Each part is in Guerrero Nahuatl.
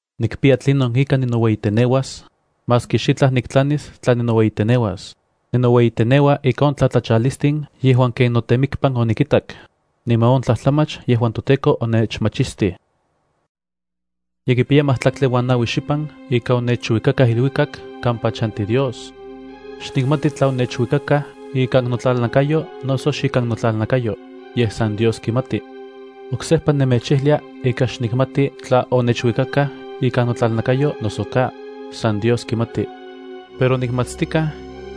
Nikpiya tlinon ika ninoueyiteneuas, maski xitlaj niktlanis tla ninoueyiteneuas. Ninoueyiteneua ika on tlatlachalistin yejuan ken notemikpan onikintak, niman on tlajtlamach yejuan toTEKO onechmachistij. Ye kipiya majtlaktli uan naui xipan ika onechuikakaj iluikak kampa chanti Dios. Xnikmati tla onechuikakaj ikan notlalnakayo noso xikan notlalnakayo, yej san Dios kimati. (Oksejpa nemechijlia ika xnikmati tla onechuikakaj ikan notlalnakayo noso ka, san Dios kimati.) Pero nikmatstikaj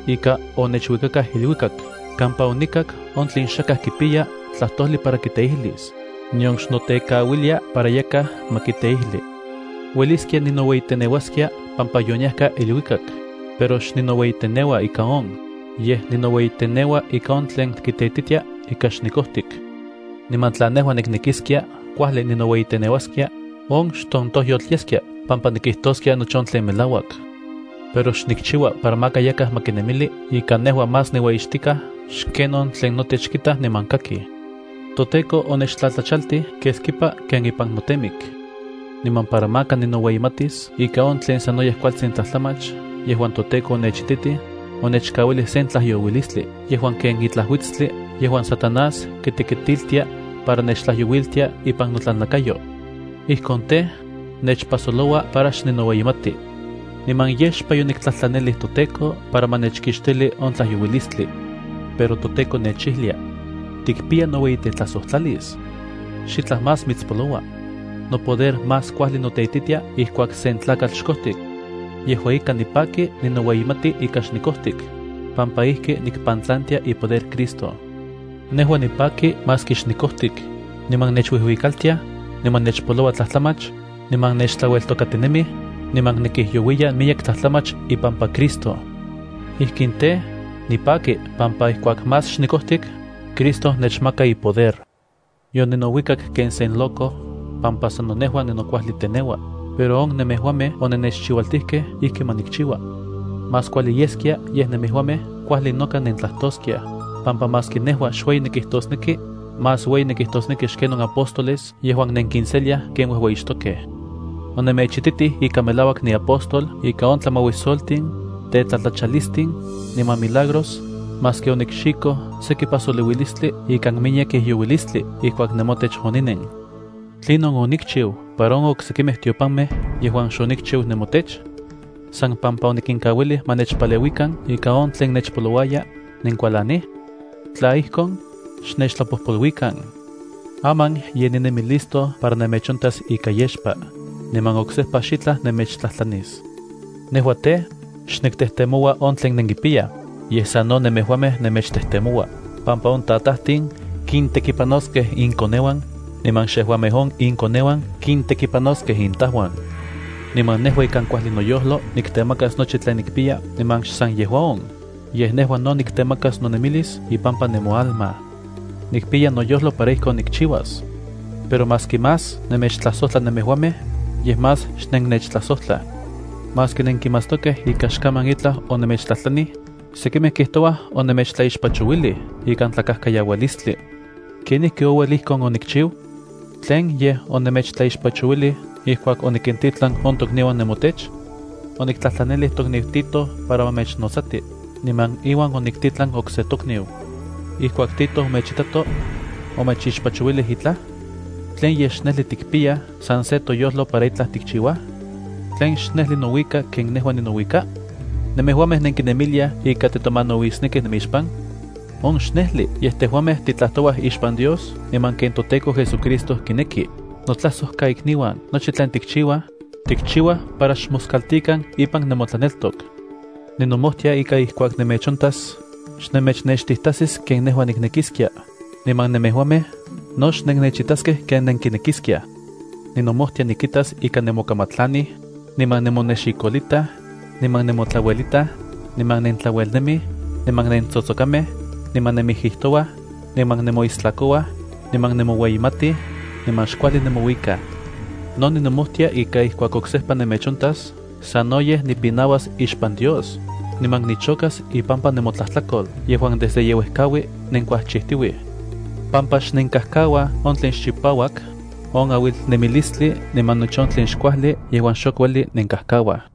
ika onechuikakaj iluikak kampa onikak on tlen xakaj kipiya tlajtojli para kiteijlis, nion xnotekauilia para yakaj ma kiteijli. Ueliskia ninoueyiteneuaskia pampa yoniajka iluikak, pero xninoueyiteneua ika on. Yej ninoueyiteneua ika on tlen kiteititia ika xnikojtik. Niman tla nejua niknekiskia kuajli ninoueyiteneuaskia, on xtontojyotl yeskia pampa nikijtoskia nochi on tlen melauak. Pero xnikchiua para maka yakaj ma kinemili ika nejua más niueyixtikaj xken on tlen notech kitaj niman kakij. ToTEKO onechtlatlachaltij keskipa ken ipan notemik. Niman para maka ninoueyimatis ika on tlen sanoyej kualtsin tlajtlamach yejuan toTEKO onechititij, onechkauilij sen tlajyouilistli yejuan ken itlaj uitstli yejuan Satanás kitekitiltia para nechtlajyouiltia ipan notlalnakayo. Ijkon tej, nechpajsoloua para xninoueyimati. Niman yexpa yoniktlajtlanilij toTEKO para ma nechkixtili on tlajyouilistli. Pero toTEKO nechijlia: “Tikpiya noueyitetlajsojtlalis. Xitlaj más mitspoloua. Nopoder más kuajli noteititia ijkuak sen tlakatl xkojtik.” Yejua ika, nipaki ninoueyimati ika xnikojtik, pampa ijki nikpantlantia ipoder Cristo. Nejua nipaki maski xnikojtik, niman nechuijuikaltiaj, niman nechpoloua tlajtlamach, niman nechtlaueltokatinemij, niman nikijyouiya miyek tlajtlamach ipampa Cristo. Ijkin tej, nipaki pampa ijkuak más xnikojtik, Cristo nechmaka ipoder. Yoninouikak ken sen loco pampa sano nejua ninokuajli teneua, pero on nemejuamej onennechchiualtijkej ijki ma nikchiua. Más kuajli yeskia yej nemejuamej kuajli noka nentlajtoskiaj, pampa maski nejua xueyi nikijtosneki, más ueyi nikijtosneki xken on apóstoles yejuan nenkinseliaj ken uejueyixtokej. Onemechititij ika melauak niapóstol ika on tlamauisoltin, tetlatlachalistin, niman milagros, maski onikxikoj seki pajsolouilistli ikan miyek ijyouilistli ijkuak nemotech oninen. ¿Tlinon onikchiu para on oksekimej tiopamej yejuan xonikchiu nemotech? ¿San pampa onikinkauilij ma nechpaleuikan ika on tlen nechpolouaya, nenkualanij? Tla ijkon, xnechtlapojpoluikan. Aman ye ninemi listo para nemechontas ika yexpa, niman oksejpa xitlaj nemechtlajtlanis. Nejua tej, xniktejtemoua on tlen nenkipiyaj, yej sano nemejuamej nemechtejtemoua, pampa on tatajtin kintekipanoskej inkoneuan, niman xejuamej on inkoneuan kitekipanoskej intauan. Niman nejua ikan kuajli noyojlo niktemakas nochi tlen nikpiya, niman xsan yejua on, yej nejua no niktemakas nonemilis ipampa nemoalma. Nikpiya noyojlo para ijkon nikchiuas. Pero maski más nemechtlajsojtla nemejuamej, yej más xnennechtlajsojtlaj. Maski nenkimatstokej ika xkaman itlaj onemechtlajtlanij, sekimej kijtouaj onemechtlaixpachouilij ikan tlakajkayaualistli. ¿Kenijki ouel ijkon onikchiu? ¿Tlen yej, onemechtlaixpachouilij ijkuak onikintitlan on tokniuan nemotech? Oniktlajtlanilij tokniu Tito para ma mechnotsati, niman iuan oniktitlan okse tokniu. Ijkuak Tito omechitato, ¿omechixpachouilij itlaj? ¿Tlen yej, xnejli tikpiyaj san se toyojlo para itlaj tikchiuaj? ¿Tlen xnejli nouika ken nejua ninouika? ¿Nemejuamej nenkinemiliaj ika titomanauisnekij nemixpan? ¡On xnejli! Yej tejuamej titlajtouaj ixpan Dios niman ken toTEKO JesuCristo kineki. Notlajsojkaikniuan, nochi tlen tikchiuaj, tikchiuaj para xmoskaltikan ipan nemotlaneltok. Ninomojtia ika ijkuak nemechontas, xnemechnextijtajsis ken nejua niknekiskia, niman nemejuamej no xnennechitaskej ken nenkinekiskiaj. Ninomojtia nikitas ika nemokamatlanij, niman nemonexikolitaj, niman nemotlauelitaj, niman nentlauelnemij, niman nentsotsokamej, niman nenmijijtouaj, niman nemoistlakouaj, niman nemoueyimatij, niman xkuajli nemouikaj. No ninomojtia ika ijkuak oksejpa nemechontas sanoyej nipinauas ixpan Dios niman nichokas ipampa nomotlajtlakol yejuan desde yeuejkaui nenkuajchijtiuij. Pampa xnenkajkauaj on tlen xchipauak, on auilnemilistli niman nochi on tlen xkuajli yejuan xok ueli nenkajkauaj.